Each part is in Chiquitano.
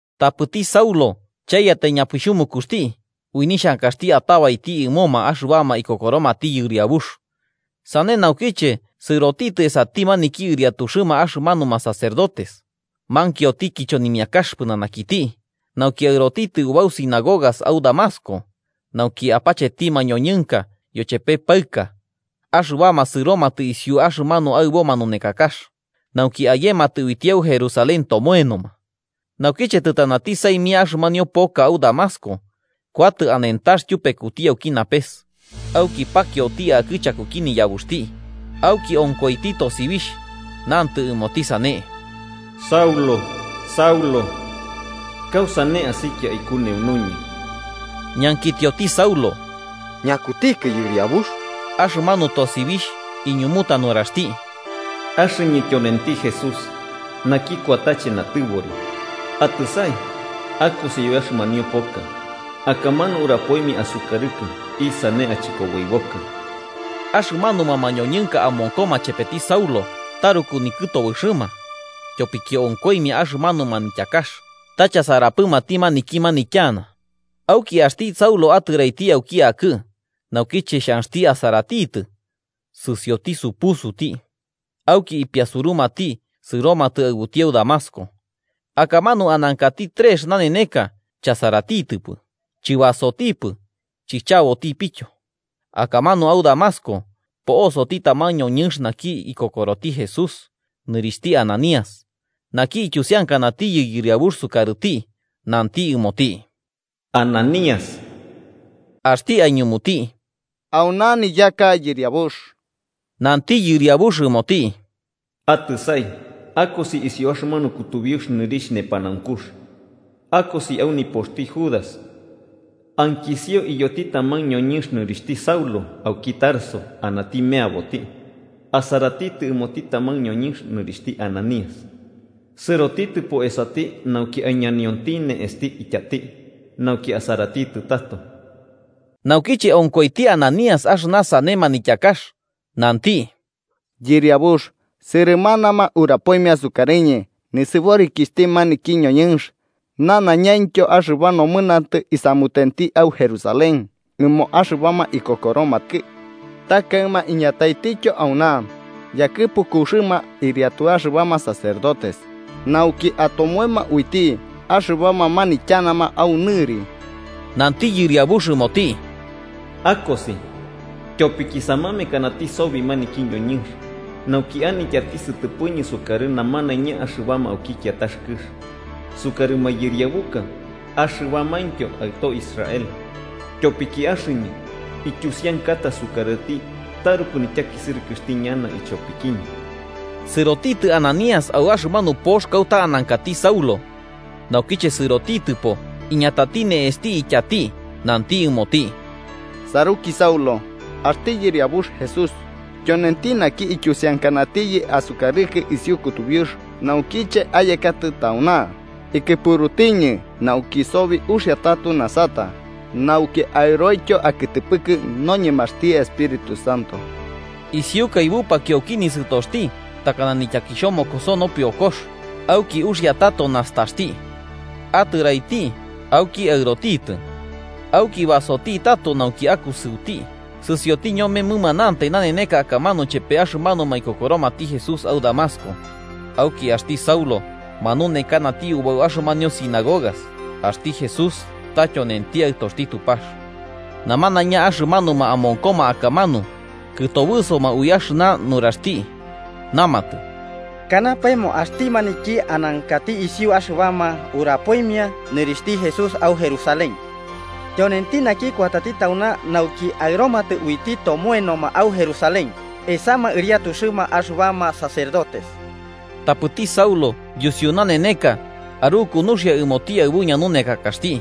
Tapɨti Saulo chaiyatai ñapixhumukuxti ui nixhankaxti atabaiti ɨmo axɨbama ikokoromati Yɨriabux. Sane naukiche sɨrotitɨ esati maniki iriatuxɨma axɨmanuma sacerdotes, mankioti kichonimiakax pɨnanakiti, nauki aɨrotitɨ ubau sinagogas au Damasco, nauki apacheti mañoñɨnka yochepe paɨka, axɨbama sɨromatɨ isiu axɨmanu aɨbo manunekakax, nauki ayematɨ uiti au Jerusalén tomoenoma. Naukiche tɨtanati saimia axɨmanio poka au Damasco, kuatɨ anentax tyupekuti auki napes. Auki pakioti akɨ chakuki niyabuxti, auki onkoiti tosibixh, nantɨ ɨmoti sane: “Saulo, Saulo, ¿kausane asikia aikuneunuñɨ?” Ñankitioti Saulo: “¿Ñakutikɨ Yɨriabux?” Axɨmanu tosibixh iñumuta nuraxti: “Axɨñɨ tyonenti Jesús, naki kuatache natɨbori. Atɨsai, akosi au axɨmanio poka. Akamanu urapoimia asukarɨkɨ isane achɨkoboibokɨ.” Axɨmanuma mañoñɨnka amonkoma chepeti Saulo taruku nikɨtobɨxɨma, tyopiki onkoimia axɨmanu manityakax, ta chasarapɨmati maniki manityana. Auki, axti Saulo atɨraiti auki akɨ, naukiche xhanxti asaratitɨ, sɨsioti supusuti. Auki ipiasurumati, sɨromatɨ aɨbuti au Damasco. Akamanu anankati trex naneneka chasaratitɨpɨ, chɨbasotipɨ, chichabotipityo. Akamanu au Damasco po'osoti taman ñoñɨnx naki ikokoroti Jesús, nɨrixhti Ananías, naki ityusiankanatiyɨ Yɨriabux sukarɨti, nanti ɨmoti: “¡Ananías!” Axti aiñumuti: “Auna niyaka, Yɨriabux.” Nanti Yɨriabux ɨmoti: “Atɨsai akosi isiu axɨmanu kutubiux nɨrixh Nepanaunkux, akosi au nipoxti Judas, ankisio iyoti taman ñoñɨnx nɨrixhti Saulo, auki Tarso, anati meaboti, asaratitɨ ɨmoti taman ñoñɨnx nɨrixhti Ananías sɨrotitɨpo esati nauki aiñanionti ne'esti ityati, nauki asaratitɨ tato.” Naukiche onkoiti Ananías axɨna sane manityakax, nanti: “Yɨriabux, sɨrɨmanama urapoimia sukarɨñɨ nisɨborikixhti maniki ñoñɨnx, nanaiñaintyo axɨba nomɨnantɨ isamutenti au Jerusalén ɨmo axɨbama ikokoromakɨ. Ta kaɨma iñataitityo auna, yakɨpukuxɨma ɨriatu axɨbama sacerdotes, nauki atomoema uiti axɨbama manityanama au nɨri.” Nanti Yɨriabux ɨmoti: “Akosi, tyopiki samamekanati sobi maniki ñoñɨnx, nauki anityati sɨtɨpɨñɨ sukarɨ namanaiña axɨbama auki kiatax kɨx, sukarɨ mayɨriabuka axɨbamaintyo aɨtoxti Israel, tyopiki axɨñɨ ityusiankata sukarɨti taruku nityakisɨrɨkɨxti ñana ichopikiñɨ. Sɨrotitɨ Ananías au axɨmanu pox kauta anankati Saulo. Naukiche sɨrotitɨpo iñatati ne'esti ityati, nanti ɨmoti: –Saruki Saulo, axti Yɨriabux Jesús, tyonenti maniki ityusiankanatiyɨ asukarɨkɨ isiu kutubiux naukiche ayekatɨ tauna, ikɨpurutiñɨ nauki sobi uxia tato nasata, nauki aɨroityo akɨtɨpɨkɨ noñemaxti Espíritu Santo. Isiukai bupakio auki nisɨtoxti takana nityaki nopiokox auki uxia tato nastaxti. Atɨraiti auki aɨrotitɨ. Auki basoti tato nauki akusɨuti, sɨsioti ñome mɨmanantai naneneka akamanu chepe axɨmanuma ikokoromati Jesús au Damasco. Auki axti Saulo manunekanati ubau axɨmanio sinagogas axti Jesús ta tyonenti Aɨtoxti Tupax. Namanaiña axɨmanuma amonkoma akamanu kɨtobɨsoma ui axɨna nuraxti, namatɨ: –¿Kanapaemo axti maniki anankati isiu axɨbama urapoimia nɨrixhti Jesús au Jerusalén? Tyonenti naki kuatati tauna nauki aɨromatɨ uiti tomoenoma au Jerusalén, esama ɨriatuxɨma axɨbama sacerdotes. Tapɨti Saulo yusiu naneneka aruku nuxia ɨmoti aɨbu ñanunekakaxti,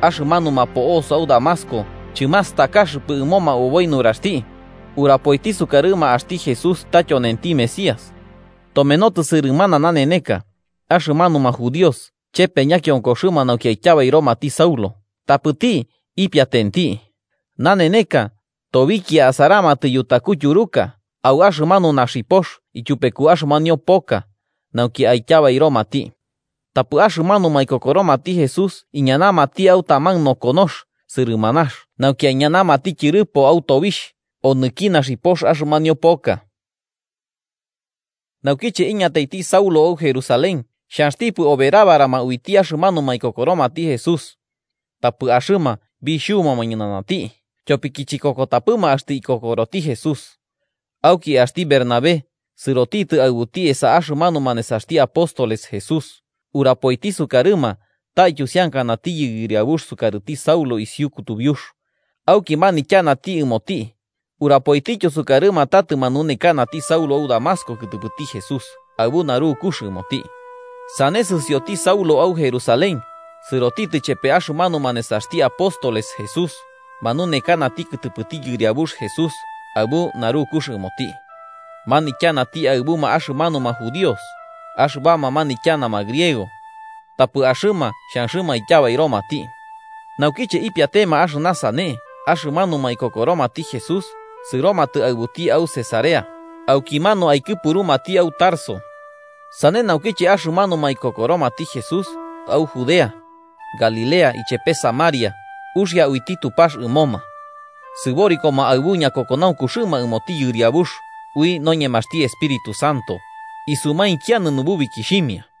axɨmanuma po'osoma au Damasco chɨmastakaxɨpɨ ɨmoma oboi nuraxti, urapoiti sukarɨma axti Jesús ta tyonenti Mesías. Tomenotɨ sɨrɨmana naneneka, axɨmanuma judíos chepe ñakionkoxɨma nauki aityabairomati Saulo, tapɨti ipiatenti. Naneneka tobikia asaramatɨ yutaku tyuruka au axɨmanu naxipox ityupeku axɨmanio poka, nauki aityabairomati, tapɨ axɨmanuma ikokoromati Jesús iñanamati au taman nokonox sɨrɨmanax nauki aiñanamati tyɨrɨpo au tobixh onɨki naxipox axɨmanio poka. Naukiche iñataiti Saulo au Jerusalén, xhanxtipɨ oberabarama uiti axɨmanuma ikokoromati Jesús. Tapɨ axɨma bixhubuma ñɨnanati, tyopiki chikokotapɨma axtɨ ikokoroti Jesús. Auki axti Bernabé sɨrotitɨ aɨbuti esa axɨmanuma nesaxti apóstoles Jesús urapoiti sukarɨma ta ityusiankanatiyɨ Yɨriabux sukarɨti Saulo isiu kutubiux, auki manityanati ɨmoti, urapoitityo sukarɨma ta tɨmanunekanati Saulo au Damasco kɨtɨpɨti Jesús aɨbu narukux ɨmoti. Sane sɨsioti Saulo au Jerusalén, sɨrotitɨ chepe axɨmanuma nesaxti apóstoles Jesús Manunekanati kɨtɨpɨti Yɨriabux Jesús aɨbu narukux ɨmoti. Manityanati aɨbuma axɨmanuma judíos axɨbama manityanama griego. Tapɨ axɨma xhanxɨma aityabairomati. Naukiche ipiatema axɨna sane axɨmanuma ikokoromati Jesús, sɨromatɨ aɨbuti au Cesarea, aukimanu aikɨpurumati au Tarso. Sane naukiche axɨmanuma ikokoromati Jesús, au Judea, Galilea, ichepe Samaria, uxia uiti Tupax ɨmoma. Sɨborikoma aɨbu ñakokonaunkuxɨma ɨmoti Yɨriabux, ui noñemaxti Espíritu Santo, isumainkianɨ nububikixhimia.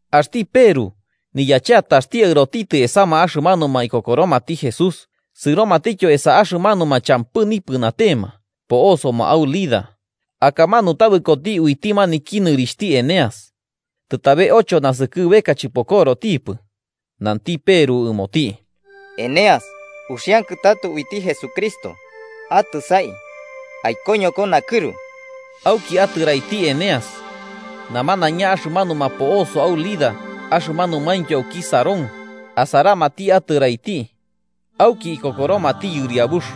Axti Peru, niyacheataxti aɨrotitɨ esama axɨmanuma ikokoromati Jesús, sɨrotitityo esa axɨmanuma champɨ nipɨnatema po'osoma au Lida. Akamanu tabɨkoti uiti maniki nɨrixhti Eneas, tɨtabe ocho naskɨbeka chɨpokorotipɨ. Nanti Peru ɨmoti: –Eneas, uxiankɨ tato uiti Jesucristo. Atɨsai, aikoñoko nakɨru. Auki atɨraiti Eneas. Namanaiña axɨmanuma po'osoma au Lida axɨmanumaintyo auki Sarón asaramati atɨraiti, auki ikokoromati Yɨriabux.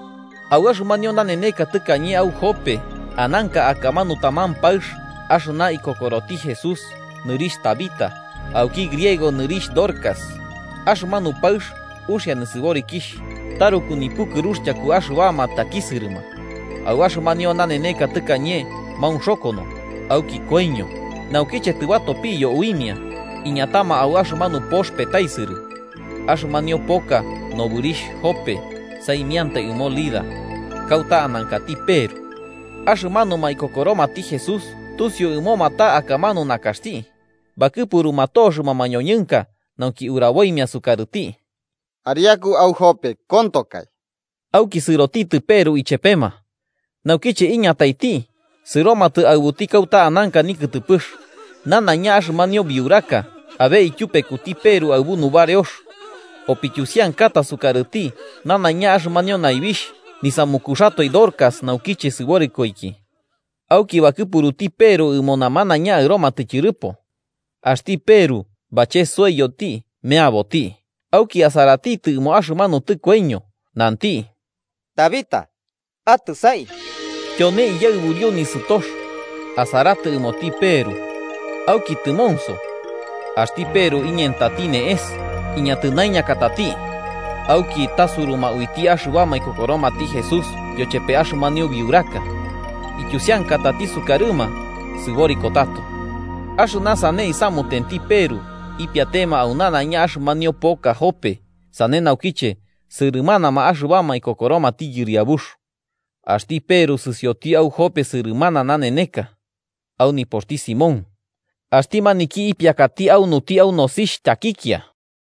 Au axɨmanio naneneka tɨkañe au Jope ananka akamanu taman paɨx axɨna ikokoroti Jesús nɨrixh Tabitá, auki griego nɨrixh Dorcas. Axɨmanu paɨx uxia nisɨborikixh, taruku nipukɨrux tyaku axɨbama takisɨrɨma. Au axɨmanio naneneka tɨkañe maunxokono, auki koiño. Naukiche tɨbatopiyo uimia, iñatama au axɨmanu pox petaisɨrɨ. Axɨmanio poka nobɨrixh Jope saimiantai ɨmo Lida, kauta anankati Peru. Axɨmanuma ikokoromati Jesús tusiu ɨmoma ta akamanu nakaxti, bakɨpuruma toxɨma mañoñɨnka nauki uraboimia sukarɨti: “Ariaku au Jope, kontokai.” Auki sɨrotitɨ Peru ichepema. Naukiche iñataiti, sɨromatɨ aɨbuti kauta ananka nikɨtɨpɨx. Nanaiña axɨmanio biuraka abe ityupekuti Peru aɨbu nubareox, opityusiankata sukarɨti nanaiña axɨmanio naibixh nisamukuxatoe Dorcas naukiche sɨborikoiki. Auki bakɨpuruti Peru ɨmo namanaiña aɨromatɨ tyɨrɨpo. Axti Peru bachesoiyoti meaboti, auki asaratitɨ ɨmo axɨmanu tɨkoiño, nanti: –¡Tabita, atɨsai! Tyone iyaɨburio nisɨtox, asaratɨ ɨmoti Peru. Auki tɨmonso. Axti Peru iñentati ne'es, iñatɨnaiñakatati. Auki tasuruma uiti axɨbama ikokoromati Jesús yochepe axɨmanio biuraka. Ityusiankatati sukarɨma, sɨboriko tato. Axɨna sane isamutenti Peru, ipiatema au nanaiña axɨmanio poka Jope, sane naukiche sɨrɨmanama axɨbama ikokoromati Yɨriabux. Axti Peru sɨsioti au Jope sɨrɨmana naneneka, au nipoxti Simón, axti maniki ipiakati aunuti au nosixh tyakikia.